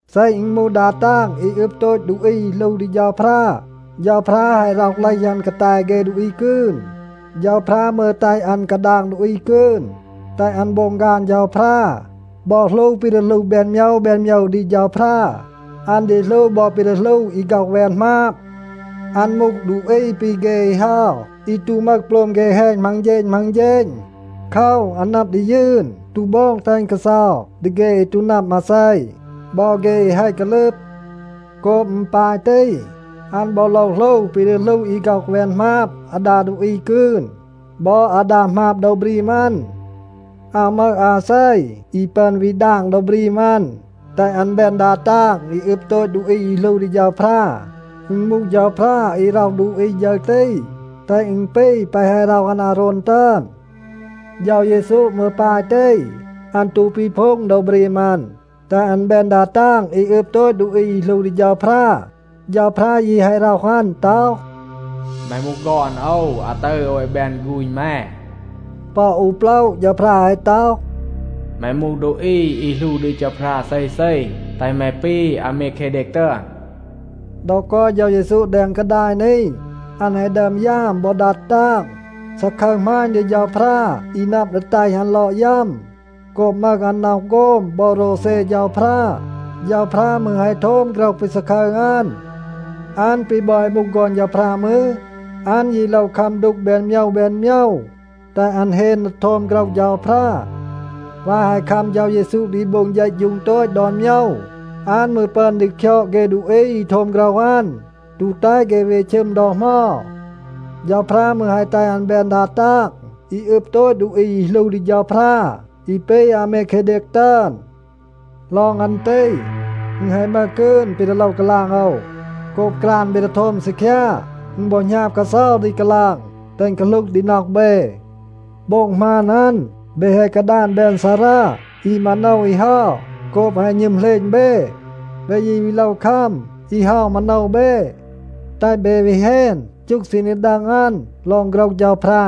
เซ อึณ มูห ดา ตาง อี อึบ โตต ดูอี อี หลู ดี เฌาพรา, เฌาพรา แฮะ ร็อห เลห อัน กาแต เฆ ดูอี กืน. เฌาพรา มืร แตห อัน กาดาง ดูอี กืน, แตห อัน โบง ฆาน เฌาพรา บอ หลู ปี ดี หลู แบน โมยว แบน โมยว ดี เฌาพรา. อัน ดี หลู บอ ปี ดี หลู อี ฆ็อห แวน หมาบ. อัน มูห ดูอี ปี เฆ อี เฮา อี ตู มึห โปลม เฆ แฮณ มัง เฌณ มัง เฌณ. โคว, อัน นับ ดี ยืน, ตู โบง แตห อึณ กาเซา ดี เฆ อี ตู นับ มาเซ บอ เฆ อี แฮะ กาลึบ. โกบ อึณ ปาย ตี, อัน บอ โลว หลู ปี ดี หลู อี ฆ็อห แวน หมาบ อาดา ดูอี กืน, บอ อาดา หมาบ โดว บรีม อัน. อาว มึห อาเซ อี ปึอน วี ดาง โดว บรีม อัน, แตห อัน แบน ดา ตาง อี อึบ โตต ดูอี อี หลู ดี เฌาพรา. อึณ มูห เฌาพรา อี ร็อห ดูอี ฌึร ตี, แตห อึณ ปี แปะ แฮะ ร็อห อัน อาโรน ตึอน. เฌา เยซู มืร ปาย ตี, อัน ตู ปีพูง โดว บรีม อัน, แตห อัน แบน ดา ตาง อี อึบ โตต ดูอี อี หลู ดี เฌาพรา. เฌาพรา ยี แฮะ ร็อห อัน ต็อห, “แม มูห ฆอน โอว. อาตึร โอว แฮะ แบน ฆูณ แม.” ปอ อู โปละ เฌาพรา แฮะ ต็อห, “แม มูห ดูอี อี หลู ดี เฌาพรา เซเซ, แตห แม ปี อาเมเคเดก ตึอน.” ดอ กอย เฌา เยซู แดง กาดาย นี, อัน แฮะ ดึอม ยาม บอ ดัด ตาง, ซาคึร หมาณ ดี เฌาพรา อี นับ ดี แตห อัน ลอด ยัม. โกบ มึห อัน น็อห โฆม บอ โรวเซ เฌาพรา, เฌาพรา มืร แฮะ โทม โฆรห ปี ซาคึร อัน. อัน ปี บอ แฮะ มูห ฆอน เฌาพรา มืร, อัน ยี โลว คัม ดูก แบน โมยว แบน โมยว, แตห อัน เฮน ดี โทม โฆรห เฌาพรา. วาย แฮะ คัม เฌา เยซู ดี โบง เฌะฌูง โตต ดอน โมยว, อัน มืร ปึอน ดี คยอด เฆ ดูอี อี โทม โฆรห อัน, ตู แตห เฆ วี ชึม ดอ เหมา. เฌาพรา มืร แฮะ แตห อัน แบน ดา ตาง อี อึบ โตต ดูอี อี หลู ดี เฌาพรา อี ปี อาเมเคเดก ตึอน. ลอง อัน ตี, อึณ แฮะ มึห กืน ปี ดี โลว กาลาง โอว. โกบ กราน เบ ดี โทม ซีคยา, อึณ บอ หณาบ กาเซา ดี กาลาง แตห อึณ กาหลูห ดี น็อห เบ. โบ็ง หมาน อัน, เบ แฮะ กาดาน แบน ซารา อี มาโนว อี เฮา โกบ แฮะ หณึม เหลณ เบ. เบ ยี วี โลว คัม อี เฮา มาโนว เบ, แตห เบ วี เฮน จูห ซีณ ดี ดัง อัน ลอง โฆรห เฌาพรา.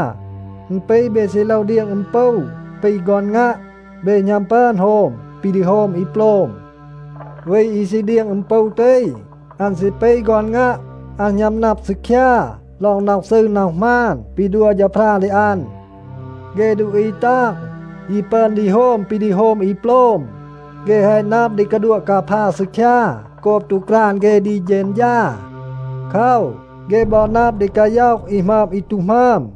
อึณ ปี เบ ซี โลว เดียง อึม ปู ปี ฆอน งัะ. เบ หณัม ปึอน โฮม ปี ดี โฮม อี โปลม. วี อี ซี เดียง อึม ปู ตี, อัน ซี ปี ฆอน งัะ, อัน หณัม นับ ซีคยา ลอง น็อห ซืร น็อห หมาน ปี ดัว เฌาพรา ดี อัน. เฆ ดูอี ตาง ยี ปึอน ดี โฮม ปี ดี โฮม อี โปลม. เฆ แฮะ นับ ดี กาดัวะ กาพา ซีคยา โกบ ตู กราน เฆ ดี เฌณฌา. โคว, เฆ บอ นับ ดี กาย็อห อี หมึอม อี ตู หมึอม.